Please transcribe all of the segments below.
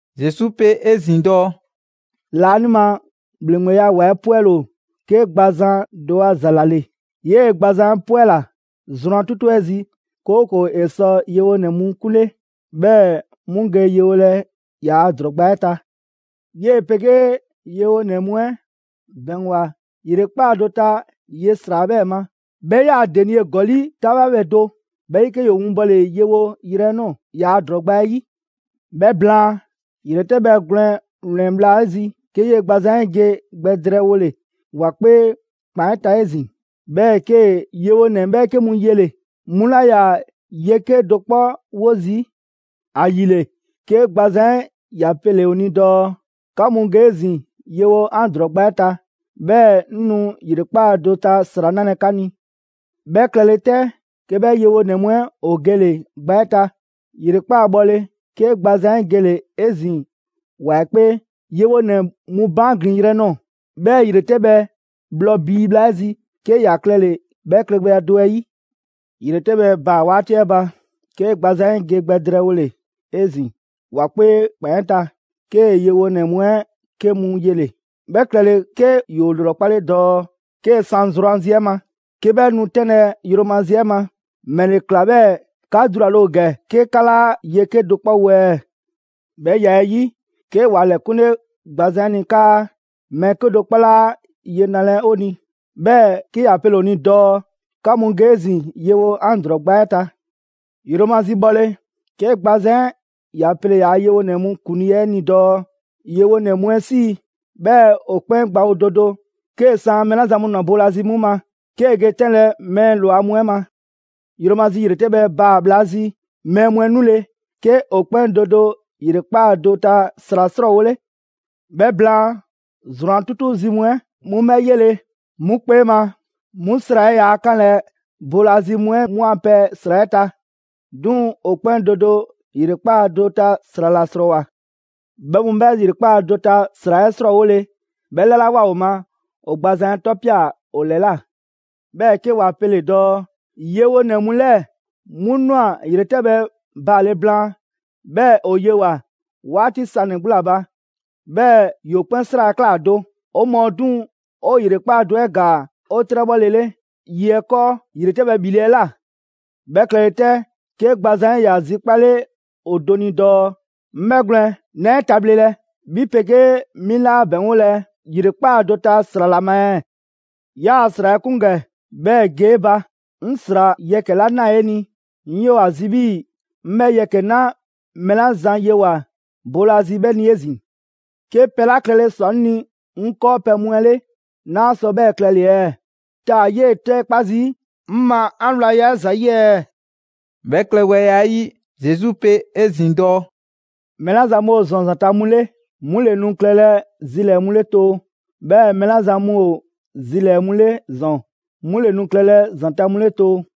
Zesu pe 'ezin‑ dɔɔ: «Laanima ‑Bhleŋgbeya ‑wa 'ɛ 'pwɛle‑ ‑o 'ke gbazan do a ‑za ‑la ‑le. 'Yee‑ gbazan 'ɛ 'pwɛla‑ zrwan 'tutu 'ɛ zi, 'kooko‑ ‑e sɔ yewonɛ mu 'kunle, 'bhɛɛ‑ 'mu ge yewolɛ ‑yaa' ‑drɔɔ gba 'ɛ ta. 'Yee‑ 'pegee yewonɛ mu 'ɛ ‑bɛŋgwa ‑yrekpaa' do ta ye ‑sra 'ɛ 'bhɛ ma, 'bhɛ 'yaa‑ denie ‑gɔli' 'taŋbha do. 'Bhɛ 'yi 'ke ‑yoo winbɔle yewo yrɛ nɔɔ‑ ‑yaa' ‑drɔɔ gba 'ɛ 'yi. 'Bhɛ blaan, ‑yretɛbhɛ gwlɛn ‑wlɛn bhla 'ɛ zi, 'ke 'yee‑ gbazan 'ɛ ge gbɛ drɛɛwole ‑wa 'kpee ‑kpan 'ɛ ta 'ezin‑, 'bhɛɛ‑ 'kee‑ yewonɛ 'bhɛɛke mu yele‑: 'Mu 'laa ‑yaa ye 'kedo‑ 'kpɔ 'wo zii'. ‑Ayile, 'ke gbazan 'ɛ ‑ya pele‑ ‑o ni dɔɔ: ‹'Ka mu ge 'ezin‑ yewo 'an ‑drɔɔ gba 'ɛ ta, 'bhɛɛ‑ 'ŋ nu ‑yrekpaa' do ta ‑sra 'nalɛ‑ 'ka ni.› 'Bhɛ klɛle 'tɛ, 'ke 'bhɛ yewonɛ mu 'ɛ ‑o gele‑ gba 'ɛ ta. ‑Yrekpaa' bhɔle, 'ke gbazan 'ɛ gele‑ 'ezin‑ ‑wa 'ɛ 'kpee, yewonɛ mu baan' ‑glin yrɛ nɔɔ‑; 'bhɛɛ‑ ‑yretɛbhɛ bhlɔ bii bhla 'ɛ zi, 'ke ‑ya klɛle‑ 'bhɛ klɛgbɛya do 'ɛ 'yi. ‑Yretɛbhɛ baa‑ 'waati 'ɛ ba, 'ke gbazan 'ɛ ge gbɛ drɛɛwole 'ezin‑ ‑wa 'kpee ‑kpan 'ɛ ta, 'kee‑ yewonɛ mu 'ɛ 'ke mu yele‑. 'Bhɛ klɛle 'ke ‑yoo ‑lrɔkpale dɔɔ: ‹'Kee‑ 'san zrwanzi 'ɛ ma, 'ke 'bhɛ nu 'tɛnlɛ‑ yromazi 'ɛ ma, ‑mɛle ꞊kla 'bhɛɛ‑ 'ka dulale ‑o ‑gɛ 'ke 'ka 'laa ye 'kedo‑ 'kpɔ wo ɛɛ?› 'Bhɛ ya 'ɛ 'yi, 'ke ‑wa ‑lɛkunle gbazan 'ɛ ni 'kaa: ‹Mɛɛ 'kedo‑ 'kpɔ 'laa ye nalɛ ‑o ni.› 'Bhɛɛ‑ 'ke ‑ya pele‑ ‑o ni dɔɔ: ‹'Ka mu ge 'ezin‑ yewo 'an ‑drɔɔ gba 'ɛ ta!›» «Yromazi bhɔle, 'ke gbazan 'ɛ ‑ya pele‑ ‑yaa' yewonɛ mu ‑kuŋlii 'ɛ ni dɔɔ: ‹Yewonɛ mu 'ɛ 'sii, 'bhɛɛ‑ ‑o 'kpɛn gbawo do do 'kee‑ san mɛɛ 'la zan mu ‑nwa boolazi 'mu ma, 'kee‑ ge 'tɛnlɛ‑ mɛɛ ‑lwa mu 'ɛ ma.› Yromazi ‑yretɛbhɛ baa‑ bhla zi mɛɛ mu 'ɛ 'nule‑, 'ke ‑o 'kpɛn do do ‑yrekpaa' do ta ‑sra ‑srɔɔwole. 'Bhɛ blaan, zrwan 'tutu zi mu 'ɛ, 'mu 'bhɛ 'yele‑, 'mu 'kpee ma, 'mu ‑sra 'ɛ 'yaa‑ 'kanlɛ‑ boolazi mu 'ɛ 'mu a pɛ ‑sra 'ɛ ta. 'Duŋ‑ ‑o 'kpɛn do do ‑yrekpaa' do ta ‑sra ‑la ‑srɔɔwoa. 'Bhɛ mu 'bhɛ ‑yrekpaa' do ta ‑sra 'ɛ ‑srɔɔwole, 'bhɛ 'lalawoa ‑o ma, ‑o gbazan 'ɛ 'tɔpia‑ ‑o ‑lɛla'. 'Bhɛɛ‑ 'ke wa pele‑ dɔɔ: ‹Yewonɛ mu 'lɛɛ‑ 'mu ꞊nwa ‑yretɛbhɛ baale blaan, 'bhɛɛ‑ ‑o yewoa‑ 'waati sanɛ‑ 'gbu ‑la ba, 'bhɛɛ‑ 'yoo 'kpɛn 'sra‑ 'ɛ ꞊kla do. 'O mɔɔ 'duŋ‑ 'o ‑yrekpaa' do 'ɛ ‑gaa 'o 'trɛbhɔlele ye 'ɛ 'kɔɔ ‑yretɛbhɛ ‑bhile' 'ɛ ꞊la.› 'Bhɛ klɛle 'tɛ, 'ke gbazan 'ɛ ‑ya zikpale ‑o do ni dɔɔ: ‹'Ŋ 'bhɛgwlɛn‑, 'naa 'e tabhlelɛ, 'bhi 'pegee 'mi 'laa ‑bɛŋgolɛ ‑yrekpaa' do ta ‑sra ‑la ma ɛɛ? 'Yaa‑ ‑sra 'ɛ 'kun ‑gɛ 'bhɛɛ‑ ge 'e ba. 'Ŋ ‑sra yɛkɛ‑ 'la 'naa‑ 'e ni, 'ŋ 'yoo‑ ‑a zi 'bhii‑ 'ŋ 'bhɛɛ‑ yɛkɛ‑ 'na mɛɛ la zan yewoa‑ boolazi 'bhɛ ni 'ezin‑. 'Ke pɛ 'la klɛle ‑swa 'ŋ ni 'ŋ 'kɔɔpɛ‑ mu 'ɛ 'le, 'naa sɔ 'bhɛ klɛle‑ ɛɛ? Taa‑ 'yee ‑tɛɛkpa' zii' 'ŋ ma 'an wlanya 'ɛ ‑za 'yi ɛɛ?›» 'Bhɛ klɛgbɛya 'ɛ 'yi, Zesu pe 'ezin‑ dɔɔ: «Mɛɛ 'la zan mu ‑o ‑zɔn ‑zanta' mu 'le, 'mu ‑le nu klɛlɛ zilɛɛ‑ mu 'le too; 'bhɛɛ‑ mɛɛ 'la zan mu ‑o zilɛɛ‑ mu 'le ‑zɔn, 'mu ‑le nu klɛlɛ ‑zanta' mu 'le too.»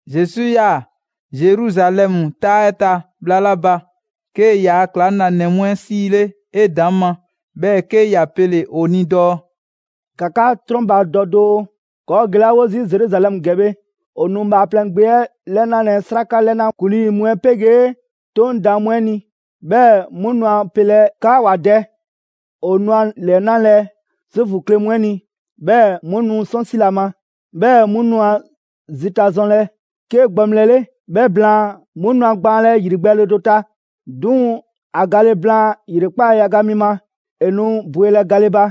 Zesu 'yaa‑ Zeruzalɛmu 'taa 'ɛ ta bhla 'la ba, 'kee‑ yaa ‑klaŋlanɛ mu 'ɛ 'siile 'edaŋma, 'bhɛɛ‑ 'ke ‑ya pele‑ ‑o ni dɔɔ: «‑Ka 'ka 'trɔnbadɔ doo, ‑kɔɔ' gelawo zii' Zeruzalɛmu ‑gɛ bhe, ‑o nu Bhaaplɛŋ Gbe 'ɛ 'lɛnalɛ 'sraka 'lɛna ‑kuŋlii mu 'ɛ 'pegee 'Toŋ daan mu 'ɛ ni, 'bhɛɛ‑ 'mu nu a pelɛ 'kaa ‑wa dɛ. ‑O nu a ‑lɛnalɛ Zuufu kle mu 'ɛ ni, 'bhɛɛ‑ 'mu nu 'sɔnsilɛ ‑a ma, 'bhɛɛ‑ 'mu nu ‑a zita zɔnlɛ 'ke gbaŋbhlɛ 'le; 'bhɛ blaan, 'mu nu a gbaanlɛ ‑yrigbɛɛle do ta. 'Duŋ‑, ‑a gale blaan ‑yrekpaa' yaga mi ma, ‑e nu bwelɛ gale ba.»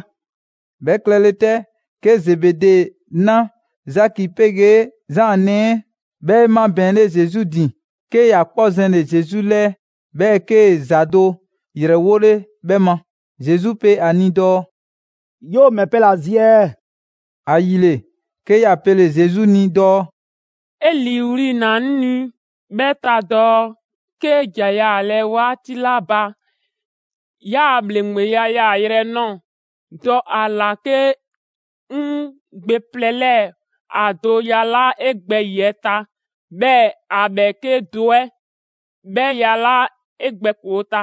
'Bhɛ klɛle 'tɛ, 'ke Zebede 'na, Zaki 'pegee Zaan nɛɛ 'ɛ, 'bhɛ 'e 'mabɛɛnle Zesu ‑din, 'ke ‑ya 'kpɔ zɛnle‑ Zesu 'lɛɛ, 'bhɛɛ‑ 'kee‑ ‑za do ‑yrɛwole 'bhɛ ma. Zesu pe ‑a ni dɔɔ: «'Yoo‑ ‑mɛ pɛ ‑la zi ɛɛ?» ‑Ayile, 'ke ‑ya pele‑ Zesu ni dɔɔ: «'E 'liiwli‑ na 'ŋ ni 'bhɛ ta dɔɔ 'kee ‑ja yaalɛ 'waati 'la ba 'yaa‑ ‑bhleŋgbeya yaayrɛ 'ɛ 'nɔɔ‑, dɔ ‑a ‑la 'ke 'ŋ gbe plɛ 'lɛɛ‑ ‑a do yalaa' 'e gbɛyiɛ ta, 'bhɛɛ‑ ‑a ‑bhɛɛke' do 'ɛ 'bhɛ yalaa' 'e gbɛkoo‑ ta.»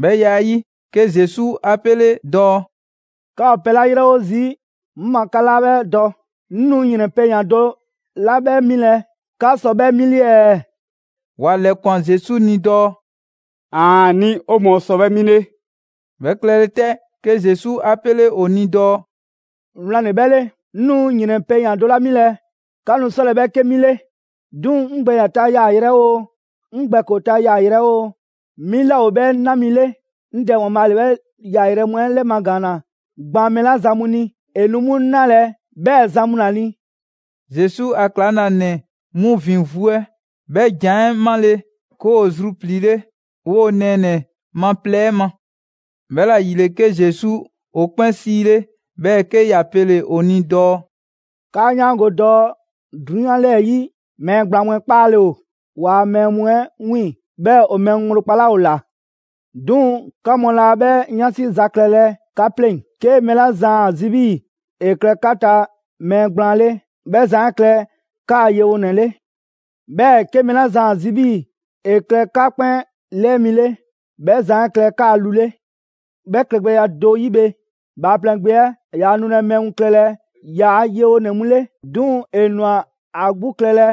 'Bhɛ ya 'ɛ 'yi, 'ke Zesu 'a 'pele dɔɔ: «'Ka ‑o pɛ 'la 'yrɛwo zii' 'ŋ ma 'ka 'laa 'bhɛ dɔ. 'Ŋ nu ‑yrɛn pɛyan‑ do 'la 'bhɛ milɛ 'ka sɔ 'bhɛ 'mile‑ ɛɛ?» ‑Wa ‑lɛkwan Zesu ni dɔɔ: «‑Aani'! 'O mɔɔ sɔ 'bhɛ 'mile.» 'Bhɛ klɛlɛ 'tɛ, 'ke Zesu 'a 'pele ‑o ni dɔɔ: «Wlan ‑le 'bhɛ 'le, 'ŋ nu ‑yrɛn pɛyan‑ do 'la 'milɛ‑ 'ka nu 'sɔlɛ‑ 'bhɛ 'ke 'milɛ‑. 'Duŋ‑ 'ŋ gbɛyiɛ ta yaayrɛ oo, 'ŋ gbɛkoo‑ ta yaayrɛ oo, 'mi 'laa ‑o 'bhɛ 'na mi 'le. 'Ŋ Dɛ ‑Waanbhaa' ‑le 'bhɛ yaayrɛ mu 'ɛ ‑lɛmagaanna gban mɛɛ 'la zan mu ni, ‑e nu 'mu 'nalɛ‑ 'bhɛɛ‑ zan mu ‑la ni.» Zesu a ‑klaŋlanɛ mu ‑vin vu 'ɛ 'bhɛ ‑jan 'ɛ 'male‑, 'ke ‑woo zrupliile 'woo‑ nɛɛnɛ‑ ma plɛ 'ɛ ma. 'Bhɛla‑ ‑yile, 'ke Zesu ‑o 'kpɛn 'siile, 'bhɛɛ‑ 'ke ‑ya pele‑ ‑o ni dɔɔ: «'Kaa 'yaango‑ dɔɔ 'drunyan 'lɛɛ‑ 'yi mɛɛ gblaan mu 'ɛ 'kpaale‑ ‑o ‑waa' mɛɛ mu 'ɛ 'wiiŋ‑, 'bhɛɛ‑ ‑o mɛɛ mu ŋgblo kpalaa' ‑o ꞊la. 'Duŋ‑, 'ka mu laa 'bhɛ 'yansi za klɛlɛ 'ka 'pleŋ‑. 'Ke mɛɛ 'la zan ‑a zi 'bhii‑ ‑e klɛ 'ka ta mɛɛ gblaan 'le, 'bhɛ zan 'ɛ klɛ 'kaa‑ yewonɛ 'le. 'Bhɛɛ‑ 'ke mɛɛ 'la zan ‑a zi 'bhii‑ ‑e klɛ 'ka 'kpɛn 'lɛɛ mi 'le, 'bhɛ zan 'ɛ klɛ 'kaa‑ lu 'le. 'Bhɛ klɛgbɛya do 'yi bhe, Bhaaplɛŋ Gbe 'ɛ yaa nulɛ mɛɛ mu klɛlɛ ‑yaa' yewonɛ mu 'le, 'duŋ‑ ‑e ꞊nwa ‑a 'gbu klɛlɛ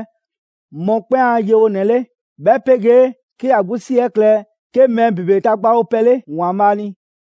mɔkpɛn' a yewonɛ 'le, 'bhɛ 'pegee 'ke ‑ya 'gbu 'si 'ɛ klɛ 'ke mɛɛ ‑bebe tagbawo pɛ 'le ‑Waanbhaa' ni.»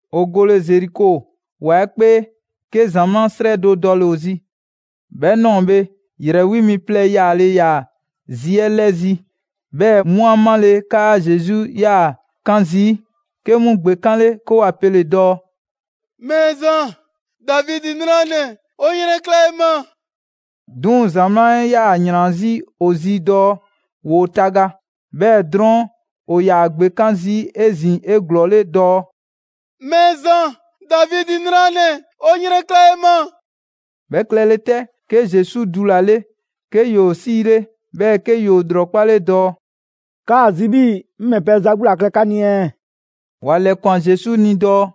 ‑O gole Zeriko ‑wa 'ɛ 'kpee, 'ke ‑zamaa' 'srɛ do dɔle‑ ‑o zi. 'Bhɛ ꞊nɔɔ bhe, ‑yrɛ 'wi mi plɛ yaale ‑yaa zi 'ɛ 'lɛzi‑, 'bhɛɛ‑ 'mu 'a male 'kaa Zesu yaa‑ 'kan zii', 'ke 'mu ‑gbekanle 'ke ‑wa pe dɔɔ: «Mɛɛzan, Davidi 'nranɛ‑, 'o 'yrɛnkla 'e ma!» 'Duŋ‑, ‑zamaa' 'ɛ 'yaa‑ ‑yran 'zi ‑o zi dɔɔ ‑woo taga. 'Bhɛɛ‑ drɔɔn', ‑o ‑yaa ‑gbekan' zii' 'ezin‑ 'eglɔɔle dɔɔ: «Mɛɛzan, Davidi 'nranɛ‑, 'o 'yrɛnkla 'e ma!» 'Bhɛ klɛle 'tɛ, 'ke Zesu dulale, 'ke ‑yoo 'siile, 'bhɛɛ‑ 'ke ‑yoo ‑lrɔkpale dɔɔ: «'Kaa‑ zi 'bhii‑ 'ŋ ‑mɛ pɛ za 'gbu ‑la klɛ 'ka ni ɛɛ?» ‑Wa ‑lɛkwan Zesu ni dɔɔ: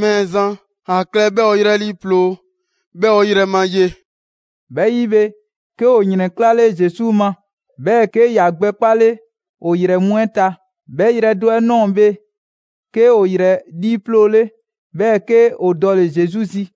«Mɛɛzan, ‑a klɛ 'bhɛɛ‑ 'o 'yrɛ 'liiploo‑, 'bhɛɛ‑ 'o yrɛ ma ye.» 'Bhɛ 'yi bhe, 'ke ‑o ‑yrɛnklale Zesu ma, 'bhɛɛ‑ 'ke ‑ya gbɛ 'kpale ‑o ‑yrɛ mu 'ɛ ta. 'Bhɛ yrɛ do 'ɛ ꞊nɔɔ bhe, 'ke ‑o ‑yrɛ 'liiploole, 'bhɛɛ‑ 'ke ‑o dɔle‑ Zesu zi.